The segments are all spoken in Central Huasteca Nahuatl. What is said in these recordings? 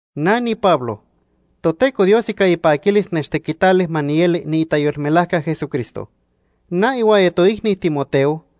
Na niPablo. Toteco Dios ica ipaquilis nechtequitali ma nieli niitayolmelajca Jesucristo. Na ihuaya toicni Timoteo,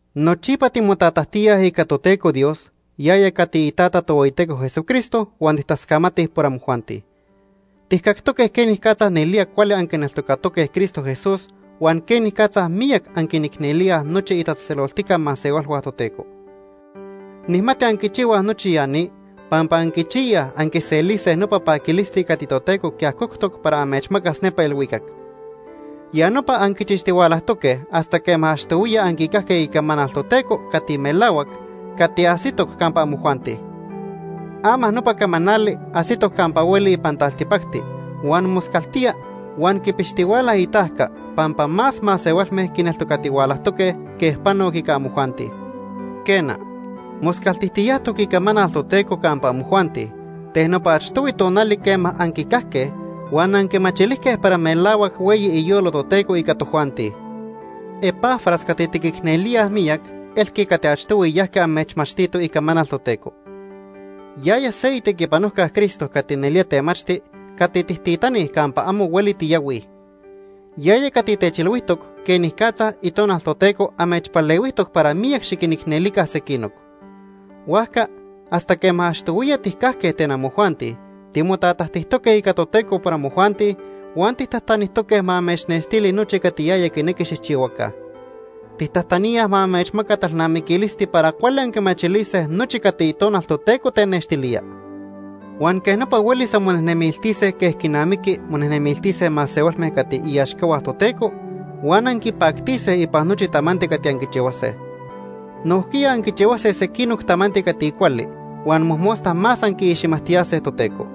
Nochipa timotatajtíaj ica Toteco Dios, yaya cati iTata Tohueyiteco Jesucristo huan tijtascamatij por amojuanti. Tijcactoque quenicatza nelía cuali anquineltocatoque Cristo Jesús huan quenicatza miyac anquinicnelíaj nochi itatzejtzeloltica masehualhua Toteco. Nijmati anquichihuaj nochi ya ni pampa anquichiyaj anquiselise nopa paquilisti cati Toteco quiajoctoc para amechmacas nepa ilhuicac. Ya nopa anquichixtihualajtoque hasta quema achtohuiya anquicajque icamanal Toteco cati melahuac, cati ajsitoc campa amojuanti. Ama nopa camanali ajsitoc campa hueli ipan taltipacti huan moscaltía huan quipixtihuala itajca pampa más masehualme quineltocatihualajtoque quej panoc ica amojuanti. Quena, moscaltijtiyajtoc icamanal Toteco campa amojuanti ten nopa achtohui tonali quema anquicajque huan anquimachilijque para melahuac hueyi iyolo Toteco ica tojuanti. Epafras cati tiquicnelíaj miyac elqui cati achtohui yajqui amechmachtito icamanal Toteco. Yaya se itequipanojca Cristo cati nelía temachti cati tijtitanij campa amo hueli tiyahuij. Yaya cati techilhuijtoc quenicatza Itonal Toteco amechpalehuijtoc para miyac xiquinicnelica sequinoc. Huajca, hasta quema achtohuiya tijcajque ten amojuanti timotatajtijtoque ica Toteco por amojuanti huan tijtajtanijtoque ma amechnextili nochi cati yaya quinequi xijchihuaca. Tijtajtaníaj ma amechmaca talnamiquilisti para cuali anquimachilise nochi cati Itonal Toteco tenextilía. Huan quej nopa huelis anmonejnemiltise quej quinamiqui monejnemiltise masehualme cati iaxcahua Toteco huan anquipactise ipan nochi tamanti cati anquichihuase. Nojquiya anquichihuilise sequinoc tamanti cati cuali huan mojmosta más anquiixmajtiyase Toteco.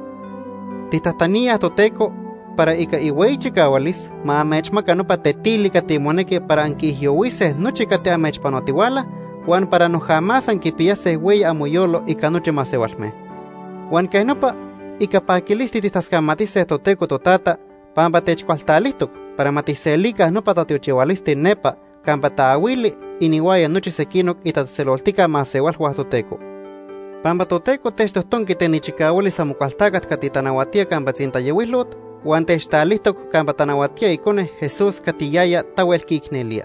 Tijtajtaníaj Toteco para ica ihueyi chicahualis ma amechmaca nopa tetili cati monequi para anquiijyohuise nochi cati amechpanotihuala huan para noja más anquipiyase hueyi amoyolo ica nochi masehualme. Huan quej nopa ica paquilisti tijtascamatise Toteco Totata pampa techcualtalijtoc para ma tijselica nopa tatiochihualisti nepa campa taahuili inihuaya nochi sequinoc itatzejtzeloltica masehualhua Toteco. Pampa Toteco techtojtonqui ten ichicahualis Amocualtacat cati tanahuatía campa tzintayohuilot huan techtalijtoc campa tanahuatía Icone, Jesús, cati yaya tahuel quiicnelía.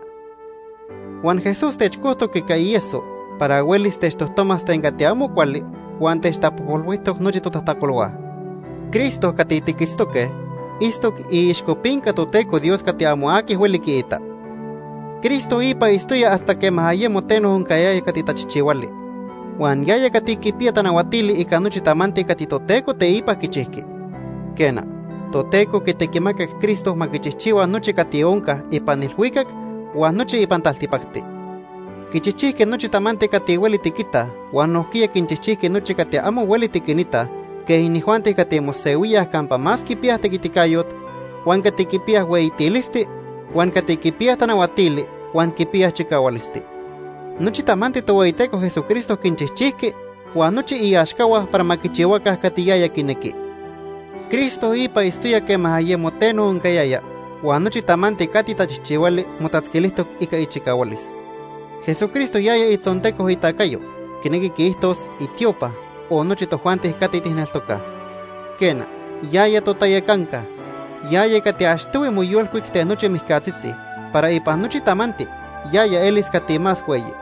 Huan Jesús techcojtoc ica ieso para huelis techtojtomas ten cati amo cuali huan techtapojpolhuijtoc nochi totajtacolhua. Cristo cati tiquitztoque itztoc iixcopinca Toteco Dios cati amo aqui hueli quiita. Cristo ipa itztoya hasta quema ayemo teno oncayaya cati tachijchihuali. Huan yaya cati quipiya tanahuatili ica nochi tamanti cati Toteco teipa quichijqui. Quena, Toteco quitequimacac Cristo ma quichijchihua nochi cati onca ipan ilhuicac huan nochi ipan taltipacti. Quichijchijqui nochi tamanti cati hueli tiquitaj huan nojquiya quinchijchijqui nochi cati amo hueli tiquinitaj quej inijuanti cati mosehuíaj campa más quipiyaj tequiticayot, huan cati quipiyaj hueyitilisti, huan cati quipiyaj tanahuatili huan quipiyaj chicahualisti. Nochi tamanti Tohueyiteco Jesucristo quinchijchijqui huan nochi iaxcahua para ma quichihuaca cati yaya quinequi. Cristo ipa itztoya quema ayemo teno oncayaya huan nochi tamanti cati tachijchihuali motatzquilijtoc ica ichicahualis. Jesucristo yaya itzonteco itacayo, quinequi quiijtos itiopa, o nochi tojuanti cati tijneltocaj. Quena, yaya totayacanca. Yaya cati achtohui moyolcuic ten nochi mijcatzitzi para ipan nochi tamanti yaya elis cati más hueyi.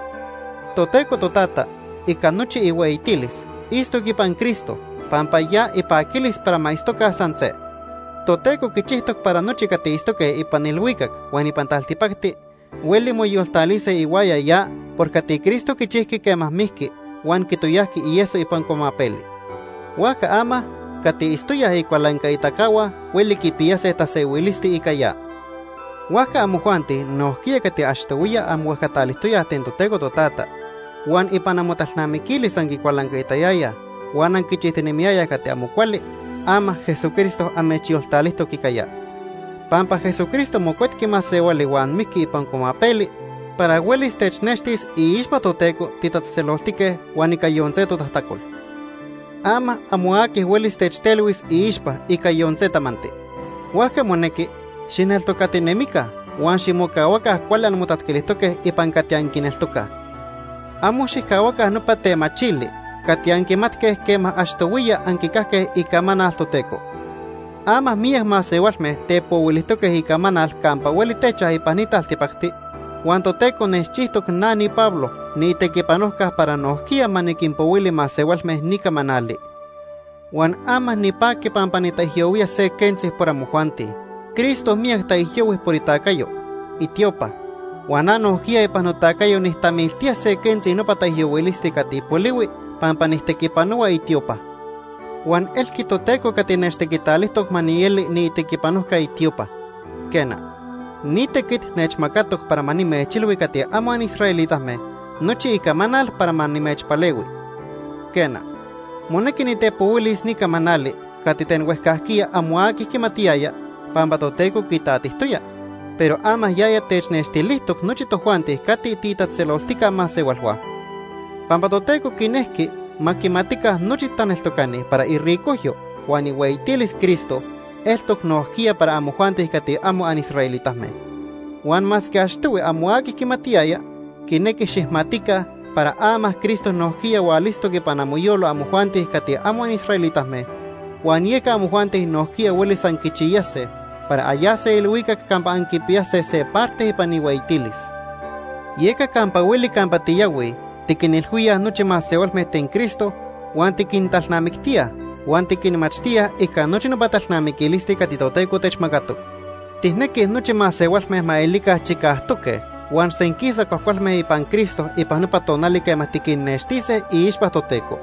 Toteco Totata ica nochi ihueyitilis itztoc ipan Cristo pampa ya ipaquilis para ma itztoca san se. Toteco quichijtoc para nochi cati itztoque ipan ilhuicac huan ipan taltipacti hueli moyoltalise ihuaya ya por cati Cristo quichijqui quema mijqui huan quitoyajqui ieso ipan cuamapeli. Huajca ama cati itztoyaj icualancaitacahua hueli quipiyase tasehuilisti ica ya. Huajca amojuanti nojquiya cati achtohuiya anmohuejcatalijtoyaj ten Toteco Totata, huan ipan amotalnamiquilis anquicualancaitayayaj huan anquichijtinemiyayaj cati amo cuali, ama Jesucristo amechyoltalijtoc ica ya. Pampa Jesucristo mocuetqui masehuali huan mijqui ipan cuamapeli para huelis technextis iixpa Toteco titatzejtzeloltique huan ica yon se totajtacol. Ama amo aqui huelis techtelhuis iixpa ica yon se tamanti. Huajca monequi xijneltocatinemica huan ximocahuaca cuali anmotatzquilijtoque ipan cati anquineltocaj. Amo xijcahuaca nopa temachili cati anquimatque quema achtohuiya anquicajque icamanal Toteco. Ama miyac masehualme tepohuilijtoque icamanal campa hueli techaj ipan ni taltipacti huan Toteco nechchijtoc na niPablo niitequipanojca para nojquiya ma niquinpohuili masehualme ni camanali. Huan ama nipaqui pampa nitaijyohuía se quentzi por amojuanti. Cristo miyac taijyohui por itacayo, itiopa, huan na nojquiya ipan notacayo nijtamiltía se quentzi nopa taijyohuilisti cati polihui pampa nijtequipanohua itiopa. Huan elqui Toteco cati nechtequitalijtoc ma nieli niitequipanojca itiopa. Quena, ni tequit nechmacatoc para ma nimechilhui cati amo anisraelitame nochi icamanal para ma nimechpalehui. Quena, monequi nitepohuilis ni camanali cati ten huejcajquiya amo aqui quimatiyaya pampa Toteco quitatijtoya, pero ama yaya technextilijtoc nochi tojuanti cati tiitatzejtzeloltica masehualhua. Pampa Toteco quinejqui ma quimatica nochi taneltocani para iricojyo huan ihueyitilis Cristo eltoc nojquiya para amojuanti cati amo anisraelitame. Huan masque achtohui amo aqui quimatiyaya, quinequi xijmatica para ama Cristo nojquiya hualitztoc ipan amoyolo amojuanti cati amo anisraelitame, huan yeca amojuanti nojquiya huelis anquichiyase para anyase ilhuicac campa anquipiyase se parte ipan ihueyitilis. Yeca campa hueli campa tiyahuij tiquinilhuíaj nochi masehualme ten Cristo huan tiquintalnamictíaj huan tiquinmachtíaj ica nochi nopa talnamiquilisti cati Toteco techmacatoc. Tijnequij nochi masehualme ma elica chicajtoque huan senquisa cuajcualme ipan Cristo ipan nopa tonali quema tiquinnextise iixpa Toteco.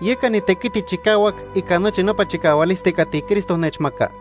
Yeca nitequiti chicahuac ica nochi nopa chicahualisti cati Cristo nechmaca.